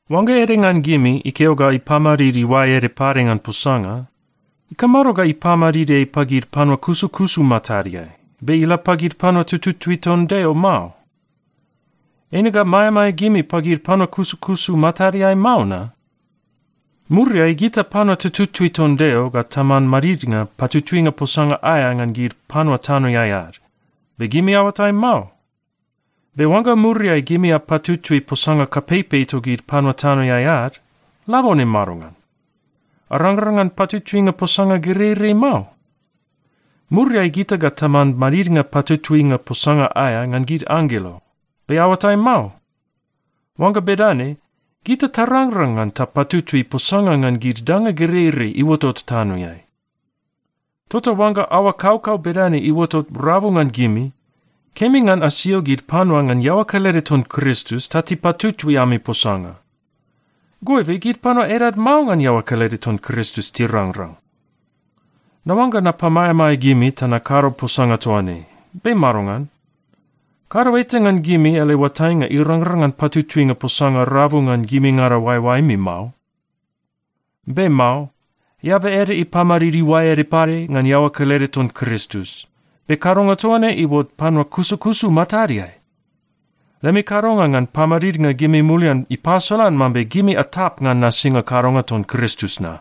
Oangga ede ngan gimi ikeo ga ipamadid iuae ede pade ngan posanga, ikamado ga ipamadid ei pagid panua kusukusu matadeai, be ila pagid panua tututui ton Deo mao? Eine ga maeamaea gimi pagid panua kusukusu matadeai mao na? Muriai gita panua tututui ton Deo ga taman madidnga patutuinga posanga aea ngan gid panua tanoeai ad, be gimi aoatai mao? Be oangga muriai gimi apatutui posanga kapeipei togid panua tanoeai ad, labone madongan? Arangrang ngan patutuinga posanga gereirei mao? Muriai gita ga taman madidnga patutuinga posanga aea ngan gid anggelo, be aoatai mao? Oangga bedane, gita tarangrang ngan tapatutui posanga ngan gid danga gereirei iuotot tanoeai. Tota oangga aoa kaukau bedane iuotot rabu ngan gimi, kemi ngan asio gid panua ngan iaoa kelede ton Kristus ta tipatutui ami posanga. Goibe, gid panua edad mao ngan iaoa kelede ton Kristus tirangrang! Naoangga napamaeamaea gimi ta nakado posanga toa ne. Be madongan? Kado eta ngan gimi ele oatainga irangrang ngan patutuinga posanga rabu ngan gimingada oaeoaemi mao? Be mao. Eaba ede ipamadid iuae ede pade ngan iaoa kelede ton Kristus. Be kadonga toa ne iuot panua kusukusu matadeai! Lemi kadonga ngan pamadidnga gimi mulian ipasolan mambe gimi atap ngan nasinga kadonga ton Kristus na.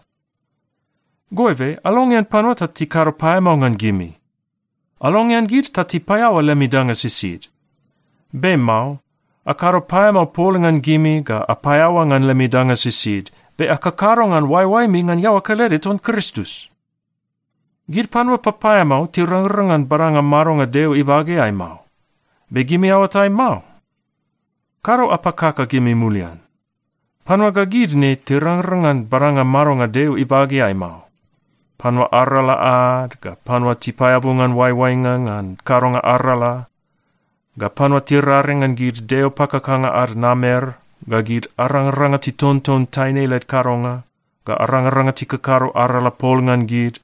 Goibe, alongean panua ta tikado paeamao ngan gimi! Alongean gid ta tipaeaoa lemi danga sisid! Be mao. Akado paeamao pol ngan gimi ga apaeaoa ngan lemi danga sisid, be akakado ngan oaeoaemi ngan iaoa kelede ton Kristus. Gid panua papaeamao tirangrang ngan badanga madonga Deo ibageai mao, be gimi aoatai mao? Kado apakaka gimi mulian. Panua ga gid ne tirangrang ngan badanga madonga Deo ibageai mao: panua arala ad, ga panua tipaeabu ngan oaioainga ngan kadonga arala, ga panua tiraring ngan gid deo pakakanga ad namer, ga gid arangaranga titonton taine led kadonga, ga arangaranga tikakado arala pol ngan gid,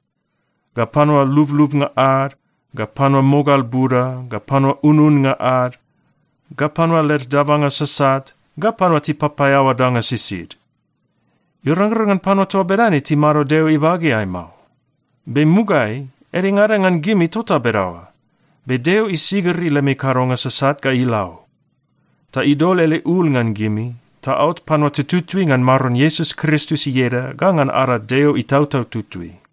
ga panua lublubnga ad, ga panua mogal buda, ga panua ununnga ad, ga panua led dabanga sasat, ga panua tipapaeaoa danga sisid. Irangrang ngan panua toa bedane timado Deo ibageai mao. Be mugaeai, edengada ngan gimi tota bedaoa. Be Deo isigiri lemi kadonga sasat ga ila o, ta idol ele ul ngan gimi, ta aot panua tututui ngan Maron Iesus Kristus ieda ga ngan ada Deo Itautau Tutui.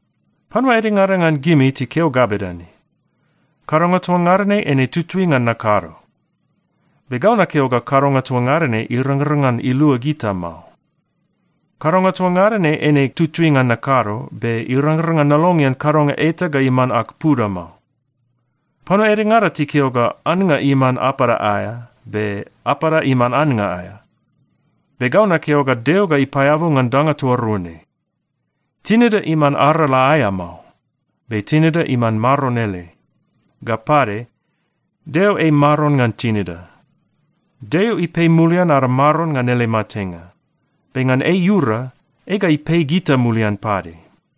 Panua edengada ngan gimi tikeo ga bedane, “Kadonga toa ngada ne eine tutui ngan nakado.” Be gau nakeo ga kadonga toa ngada ne irangrang ngan ilua gita mao. Kadonga toa ngada ne eine tutui ngan nakado, be irangrang ngan nalongean kadonga eta ga iman ag puda mao. Panua edengada tikeo ga, “Annga iman apada aea, be apada iman annga aea.” Be gau nakeo ga Deo ga ipaeabu ngan danga toa rua ne. Tinida iman arala aea mao. Be tinida iman Maron ele. Ga pade, Deo ei Maron ngan tinida. Deo ipei mulian ada Maron ngan ele matenga. Be ngan ei iura, ei ga ipei gita mulian pade.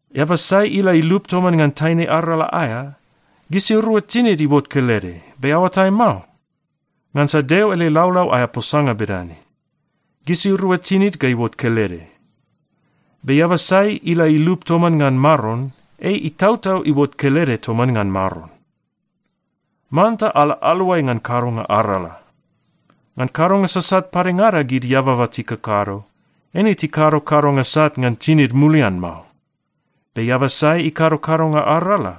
Eaba sai ila ilup toman ngan taine arala aea, gisirua tinid iuot kelede. Be aoatai mao? Ngansa Deo ele laulau aea posanga bedane, “Gisirua tinid ga iuot kelede.” Be eaba sai ila ilup toman ngan Maron, ei itautau iuot kelede toman ngan Maron. Manta ala aluai ngan kadonga arala. Ngan kadonga sasat padengada gid eababa tikakado, eine tikado kadonga sat ngan tinid mulian mao. Be eaba sai ikado kadonga arala,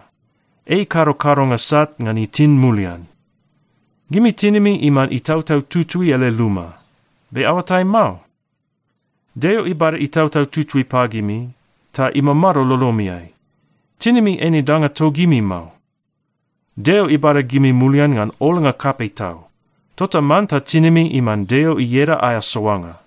ei ikado kadonga sat ngan itin mulian. Gimi tinimi iman Itautau Tutui ele luma. Be aoatai mao? Deo ibada Itautau Tutui pagimi, ta imamado lolomiai. Tinimi eine danga togimi mao. Deo ibada gimi mulian ngan olnga kapei tau. Tota manta tinimi iman Deo ieda aea soanga.